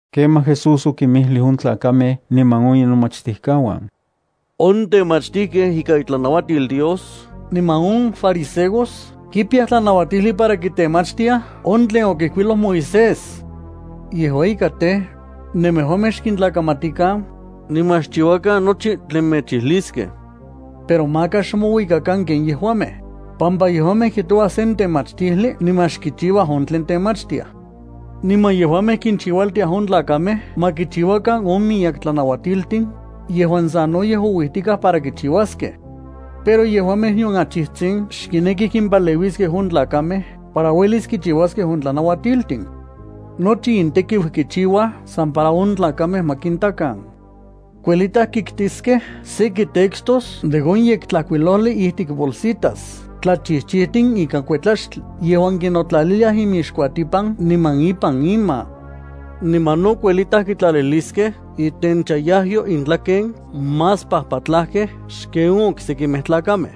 Kemaj Jesús okinmijlij on tlakamej niman on inomachtijkauan: —On temachtijkej ikan itlanauatil Dios niman on fariseos kipiyaj tlanauatijli para kitemachtiaj on tlen okijkuiloj Moisés. Yejua ika tej, nemejuamej xkintlakamatikan, niman xchiuakan nochi tlen mechijliskej. Pero maka xmouikakan ken yejuamej, pampa yejuamej kijtouaj sen temachtijli niman xkichiua on tlen temachtiaj. Niman yejuamej kinchiualtiaj on tlakamej ma kichiuakan on miyek tlanauatiltin, yejuan sanoyej ouijtikaj para kichiuaskej. Pero yejuamej nion achijtsin xkinekij kimpaleuiskej on tlakamej para uelis kichiuaskej on tlanauatiltin. ’Nochi intekiu kichiuaj san para on tlakamej ma kintakan. Kuelitaj kiktiskej seki textos de on Yektlajkuilojli ijtik bolsitas tlachijchijtin ikan kuetlaxtli yejuan kinotlaliliaj inmixkuatipan niman ipan inma. Niman no kuelitaj kitlaliliskej itenchayajyo intlaken más pajpatlajkej xken on oksekimej tlakamej.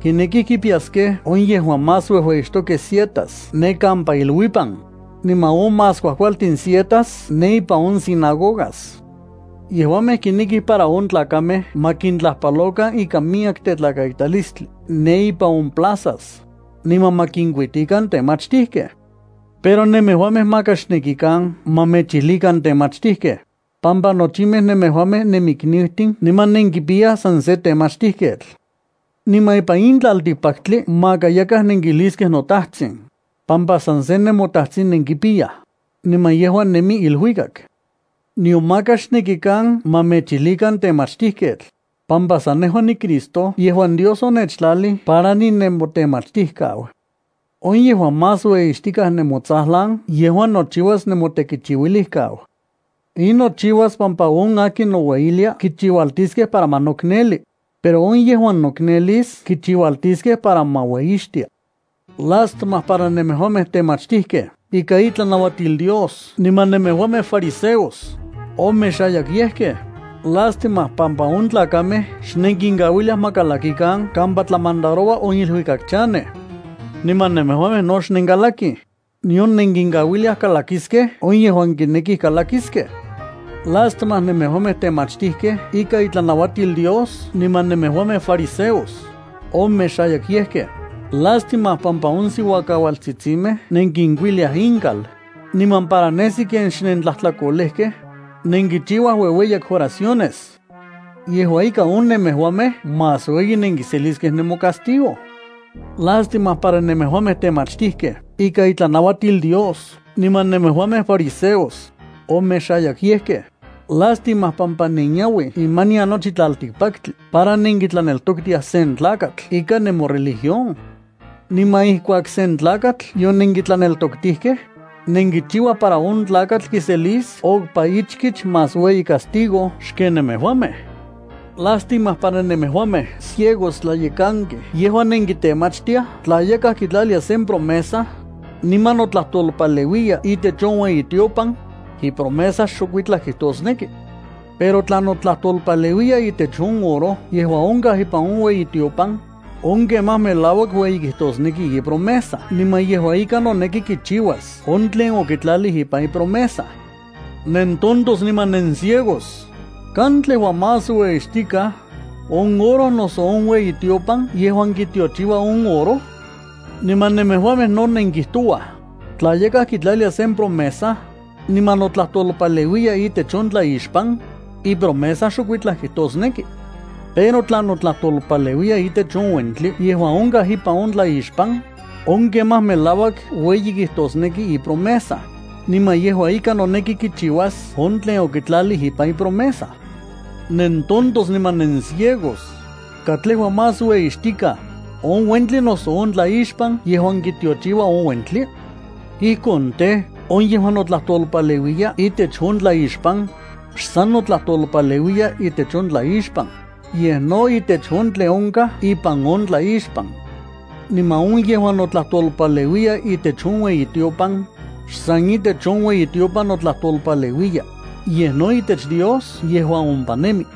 Kinekij kipiyaskej on yejuan más uejueyixtokej sietas ne kampa iluipan, niman on más kuajkualtin sietas ne ipan on sinagogas. Yejuamej kinekij para on tlakamej ma kintlajpalokan ikan miyek tetlakaitalistli ne ipan on plazas, niman ma kinkuitikan temachtijkej. ’Pero nemejuamej maka xnekikan ma mechilijkan temachtijkej, pampa nochimej nemejuamej nemiknijtin niman nenkipiyaj san se Temachtijketl. Niman ipan in tlaltikpaktli maka yakaj nenkijliskej “notajtsin”, pampa san se nemoTajtsin nenkipiyaj, niman yejua nemi iluikak. Nion maka xnekikan ma mechilijkan temachtijketl, pampa san nejua niCristo yejuan Dios onechtlalij para ninemotemachtijkau. On yejuan más ueyixtikaj nemotsajlan yejua nochiuas nemotekichiuilijkau. In nochiuas pampa on akin noueyilia kichiualtiskej para ma nokneli, pero on yejuan noknelis kichiualtiskej para ma ueyixtia. ’¡Lástima para nemejuamej temachtijkej ikan itlanauatil Dios niman nemejuamej fariseos, omexayakyejkej! Lástima, pampa on tlakamej xnenkinkauiliaj ma kalakikan kampa tlamandaroua on iluikak chanej. Niman nemejuamej no xnenkalakij, nion nenkinkauiliaj kalakiskej on yejuan kinekij kalakiskej. ’¡Lástima nemejuamej temachtijkej ikan itlanauatil Dios niman nemejuamej fariseos, omexayakyejkej! Lástima, pampa on siuakaualtsitsimej nenkinkuiliaj inkal, niman para nesi ken xnentlajtlakolejkej, nenkichiuaj uejueyak oraciones. Yejua ika on nemejuamej más ueyi nenkiseliskej nemocastigo. ’¡Lástima para nemejuamej temachtijkej ikan itlanauatil Dios niman nemejuamej fariseos, omexayakyejkej! Lástima, pampa nenyauij imanian nochi tlaltikpaktli para nenkitlaneltoktiaj sen tlakatl ikan nemoreligión. Niman ijkuak sen tlakatl yonenkitlaneltoktijkej, nenkichiuaj para on tlakatl kiselis okpa ichkich más ueyi castigo xken nemejuamej. ’¡Lástima para nemejuamej ciegos tlayekankej yejuan nenkitemachtiaj tla yakaj kitlalia sen promesa, niman notlajtolpaleuiya itech on ueyitiopan, ipromesa xokuitlaj kijtosneki. Pero tla notlajtolpaleuiya itech on oro yejuan onkaj ipan on ueyitiopan, on kemaj melauak ueyi kijtosneki ipromesa niman yejua ika noneki kichiuas on tlen okitlalij ipan ipromesa. ¡Nentontos niman nenciegos! ¿Katlejua más ueyixtikaj: on oro, noso on ueyitiopan yejuan kitiochiua on oro? Niman nemejuamej no nenkijtouaj: “Tla yakaj kitlalia sen promesa, niman notlajtolpaleuiya itech on tlaixpan, ipromesa xokuitlaj kijtosneki. Pero tla notlajtolpaleuiya itech on uentli yejuan onkaj ipan on tlaixpan, on kemaj melauak ueyi kijtosneki ipromesa, niman yejua ika noneki kichiuas on tlen okitlalij ipan ipromesa.” ¡Nentontos niman nenciegos! ¿Katlejua más ueyixtikaj: on uentli, noso on tlaixpan yejuan kitiochiua on uentli? Ijkon tej, on yejuan notlajtolpaleuiya itech on tlaixpan, xsan notlajtolpaleuiya itech on tlaixpan, yej no itech on tlen onkaj ipan on tlaixpan. Niman on yejuan notlajtolpaleuiya itech on ueyitiopan, xsan itech on ueyitiopan notlajtolpaleuiya, yej no itech Dios yejuan ompa nemi.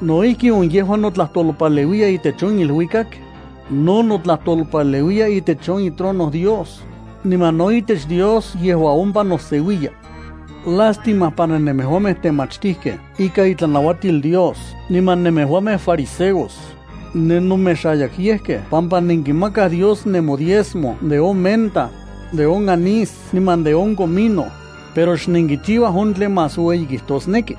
No ijki on yejuan notlajtolpaleuiya itech on iluikak, no notlajtolpaleuiya itech on itrono Dios, niman no itech Dios yejuan ompa noseuiya. ’¡Lástima para nemejuamej temachtijkej ikan itlanauatil Dios niman nemejuamej fariseos! Nenomexayakyejkej pampa nenkimakaj Dios nemodiezmo de on menta, de on anís niman de on comino, pero xnenkichiuaj on tlen más ueyi kijtosneki.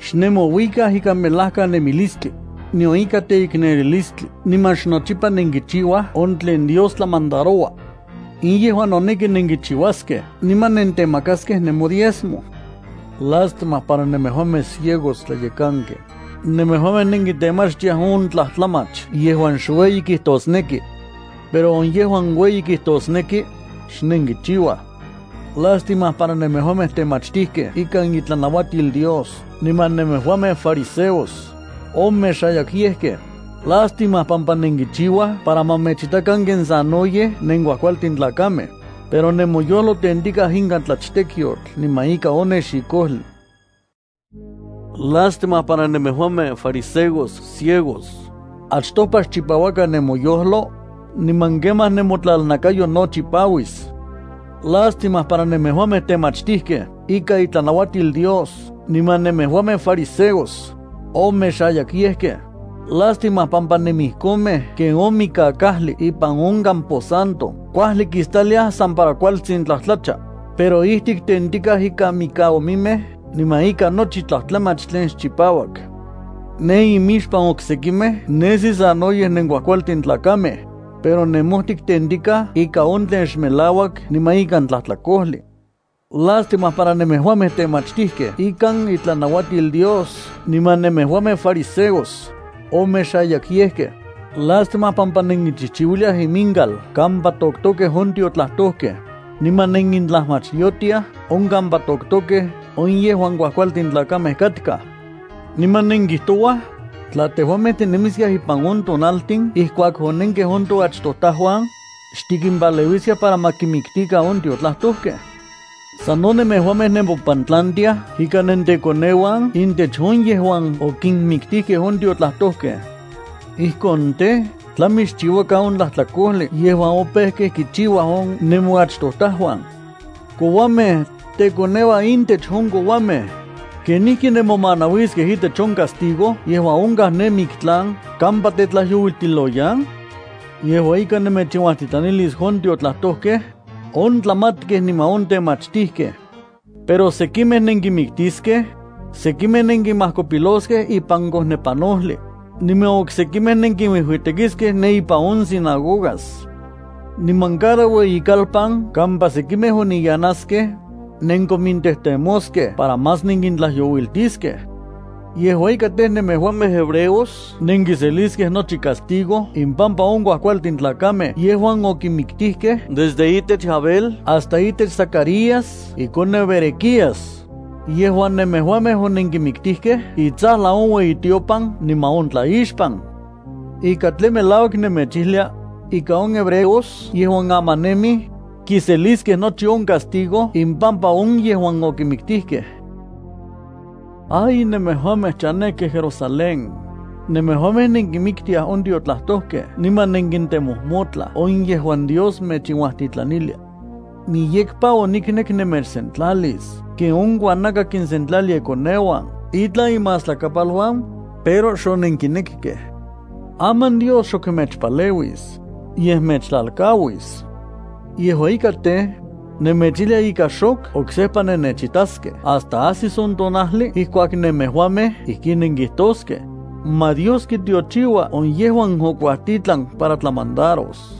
Xnemouikaj ikan melajkanemilistli, nion ikan teiknelilistli niman xnochipa nenkichiuaj on tlen Dios tlamandaroua. In yejua noneki nenkichiuaskej niman nentemakaskej nemodiezmo. ¡Lástima para nemejuamej ciegos tlayekankej! Nemejuamej nenkitemachtiaj on tlajtlamach yejuan xueyi kijtosneki. Pero on yejuan ueyi kijtosneki, xnenkichiuaj. ’¡Lástima para nemejuamej temachtijkej ikan itlanauatil Dios niman nemejuamej fariseos, omexayakyejkej! Lástima, pampa nenkichiuaj para ma mechitakan ken sanoyej nenkuajkualtin tlakamej, pero nemoyojlo tentikaj ikan tlachtekyotl niman ika on nexikojli. ¡Lástima para nemejuamej fariseos ciegos! Achtopa xchipauakan nemoyojlo, niman kemaj nemotlalnakayo no chipauis. ’¡Lástima para nemejuamej temachtijkej ikan itlanauatil Dios niman nemejuamej fariseos, omexayakyejkej! Lástima, pampa nenijkonmej ken on mikakajli ipan on camposanto kuajli kistaliaj san para kualtsin tlajtlacha, pero ijtik tentikaj ikan mikaomimej niman ikan nochi tlajtlamach tlen xchipauak. Ne imixpan oksekimej nesi sanoyej nenkuajkualtin tlakamej, pero nemojtik tentikaj ikan on tlen xmelauak niman ikan tlajtlakojli. ’¡Lástima para nemejuamej temachtijkej ikan itlanauatil Dios niman nemejuamej fariseos, omexayakyejkej! Lástima, pampa nenkinchijchiuiliaj inmika kampa toktokej on tiotlajtojkej, niman nenkitlajmachyotiaj on kampa toktokej on yejuan kuajkualtin tlakamej katkaj. Niman nenkijtouaj: “Tla tejuamej tinemiskiaj ipan on tonaltin ijkuak onenkej on toachtojtajuan, xtikimpaleuiskiaj para ma kinmiktikan on tiotlajtojkej.” Sano nemejuamej nemopantlantiaj ika nentekoneuan intech on yejuan okinmiktijkej on tiotlajtojkej. Ijkon tej, tlami xchiuakan on tlajtlakojli yejuan opejkej kichiuaj on nemoachtojtajuan. ’¡Kouamej! ¡Tekoneuan intech on kouamej! ¿Kenijki nemomanauiskej itech on castigo yejuan onkaj ne miktlan kampa tetlajyouiltiloyan? Yejua ika nemechinuajtitlanilis on tiotlajtojkej, on tlamatkej, niman on temachtijkej. Pero sekimej nenkinmiktiskej, sekimej nenkinmajkopiloskej ipan kojnepanojli, niman oksekimej nenkinuijuitekiskej ne ipan on sinagogas. Niman cada ueyikalpan kampa sekimej oniyanaskej, nenkomintejtemoskej para más nenkintlajyouiltiskej. Yejua ika tej, nemejuamej hebreos nenkiseliskej nochi castigo impampa on kuajkualtin tlakamej yejuan okinmiktijkej desde itech Abel hasta itech Zacarías ikoneu Berequías, yejuan nemejuamej onenkimiktijkej itsajlan on ueyitiopan niman on tlaixpan. Ika tlen melauak nemechijlia, ika on hebreos yejuan aman nemij, kiseliskej nochi on castigo impampa on yejuan okinmiktijkej. ’¡Ay Jerusalén! ¡Ay nemejuamej chanejkej Jerusalén! Nemejuamej nenkinmiktiaj on tiotlajtojkej niman nenkintemojmotlaj on yejuan Dios mechinuajtitlanilia. Miyekpa oniknek nemechsentlalis ken on kuanaka kinsentlalia ikoneuan itlan imastlakapaluan, pero xonenkinekkej. Aman Dios xok mechpaleuis, yej mechtlalkauis. Yejua ika tej, nemechijlia ika xok oksejpa nennechitaskej hasta ajsis on tonajli ijkuak nemejuamej ijkin nenkijtoskej: “Ma Dios kitiochiua on yejuan okuajtitlan para tlamandaros.”